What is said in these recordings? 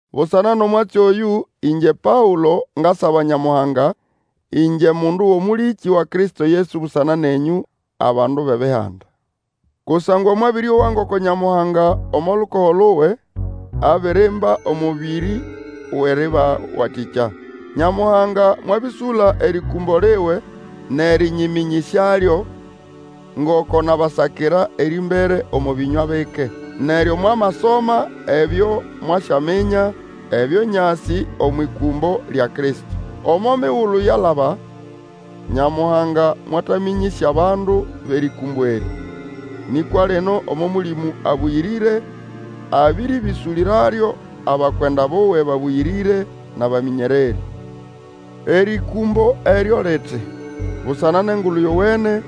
Busana nʼomwatsi oyũ, ĩngye Paũlo ngasaba Nyamuhanga, ĩngye mundu wʼomũlĩkĩ wa Kristo Yesu busana nenyũ, abandu bʼEbihanda. Kusangwa mwabĩrĩowa ngoko Nyamuhanga omo lukogo luwe abirimba omũbĩrĩ wʼerĩbawatĩkya. Nyamuhanga mwabĩsũla erĩkũmbo liwe nʼerĩnyĩmĩnyĩsyalyo, ngoko nabasakira erĩmbere omo bĩnywa bike. Neryo mwamasoma ebyo mwasyaminya ebyo nyasĩ omwʼĩkũmbo lya Kristo. Omo migulu yalaba Nyamuhanga mwatamĩnyĩsya abandu bʼerĩkũmbo erĩ; nĩkwa lino omo Mũlĩmũ Abũyĩrĩre abĩrĩbĩsũlĩralyo abakwenda buwe babũyĩrĩre nʼabamĩnyererĩ. Erĩkũmbo eryo liti, busana nʼEngulu Yowene,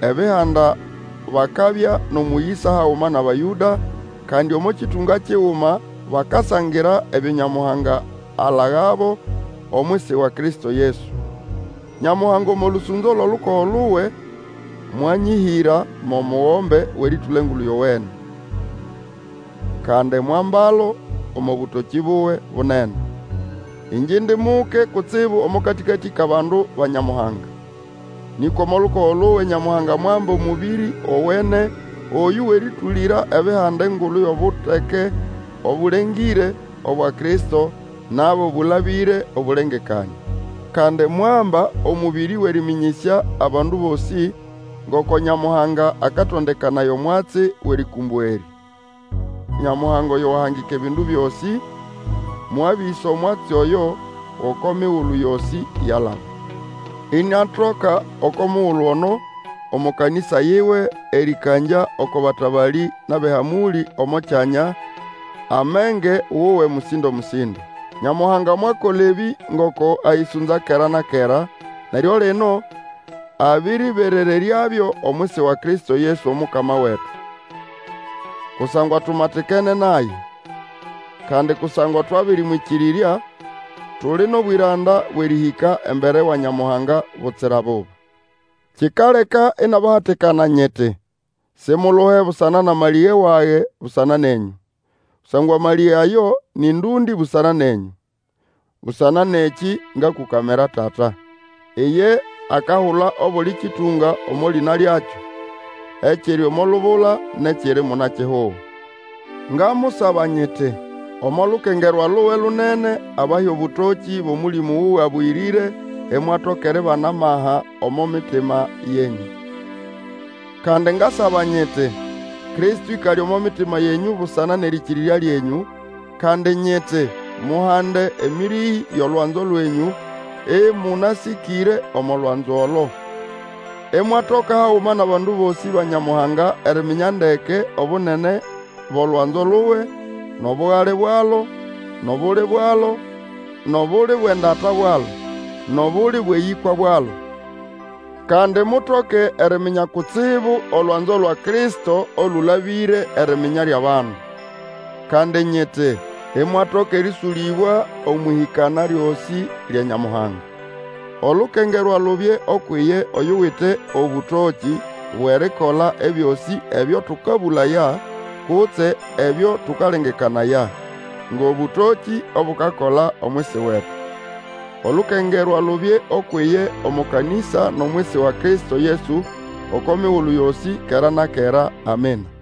Ebihanda bakabya nʼomũyĩsa haguma nʼAbayũda, kandi omo kĩtũnga kiguma bakasangira ebyo Nyamuhanga alagabo omwisi wa Kristo Yesu. Nyamuhanga omo lũsũnzo lwʼolukogo luwe mwanyĩhĩra mo mugombe wʼerĩtũla Engulu Yowene. Kandi mwambalo omo bũtokĩ buwe bunene. Ĩngye indi muke kutsibu omo katĩkatĩ kʼabandu ba Nyamuhanga, nĩkwa omo lukogo luwe Nyamuhanga mwamba omũbĩrĩ gowene oyũ wʼerĩtũlĩra Ebihanda engulu yʼobuteke obũlengĩre, obwa Kristo, nabo bũlabĩre obũlengekanĩa. Kandi mwamba omũbĩrĩ wʼerĩmĩnyĩsya abandu bosĩ ngoko Nyamuhanga akatondekanaya omwatsi wʼerĩkũmbo erĩ. Nyamuhanga oyo wahangika ebindu byosĩ, mwabĩsa omwatsi oyo gʼoko migulu yosĩ yalaba, iniatoka, oko mugulu ono, omo kanĩsa yiwe, erĩkangya oko batabalĩ nʼabʼehamũlĩ omo kyanya, amenge wuwe mũsĩndo-mũsĩndo. Nyamuhanga mwakola ebĩ ngoko ayĩsũnza kera na kera, neryo lino abĩrĩberereryabyo omwisi wa Kristo Yesu Omukama wetu. Kusangwa tumatikene naye, kandi kusangwa twabĩrĩmwĩkĩrĩrya, tuli nʼobwĩranda bwʼerĩhĩka embere wa Nyamuhanga butsira buba. Kikaleka inabahatikana nyiti, simuluhe busana nʼamalĩge wage busana nenyũ; kusangwa amalĩge ayo nĩ ndũndĩ busana nenyũ. Busana nʼekĩ ngakũkamira Tata. Iye akahula obuli kĩtũnga omo lĩna lyakyo, ekiri omo lubula nʼekiri munakihugo. Ngamusaba nyiti, omo lukengerwa luwe lunene, abahe obũtokĩ bwʼOmũlĩmũ wuwe Abũyĩrĩre imwatoka eribana amaka omo mitima yenyũ. Kandi ngasaba nyiti, Kristo ĩkale omo mitima yenyũ busana nʼerĩkĩrĩrya lyenyũ; kandi nyiti, muhande emĩrĩhĩ yʼolwanzo lwenyũ, ĩmũnasĩkĩre omo lwanzo olo. Imwatoka haguma nʼabandu bosĩ ba Nyamuhanga eriminya ndeke obunene bʼolwanzo luwe, nʼobugali bwalo, nʼobuli bwalo, nʼobuli bwʼendata bwalo, nʼobuli bwʼeyĩkwa bwalo. Kandi mutoke eriminya kutsibu olwanzo lwa Kristo olũlabĩre eriminya lyʼabandu. Kandi nyiti, imwatoka erĩũsũlĩbwa omwʼĩhĩkana lyosĩ lya Nyamuhanga. Olukengerwa lubye ukwʼiye oyuwite obũtokĩ bwʼerikola ebyosĩ ebyo tũkabũlaya kutse ebyo tũkalengekanaya, ngʼobũtokĩ obukakola omwisi wetu. Olukengerwa lubye ukwʼiye omo kanĩsa nʼomwisi wa Kristo Yesu oko migulu yosĩ, kera na kera. Amina.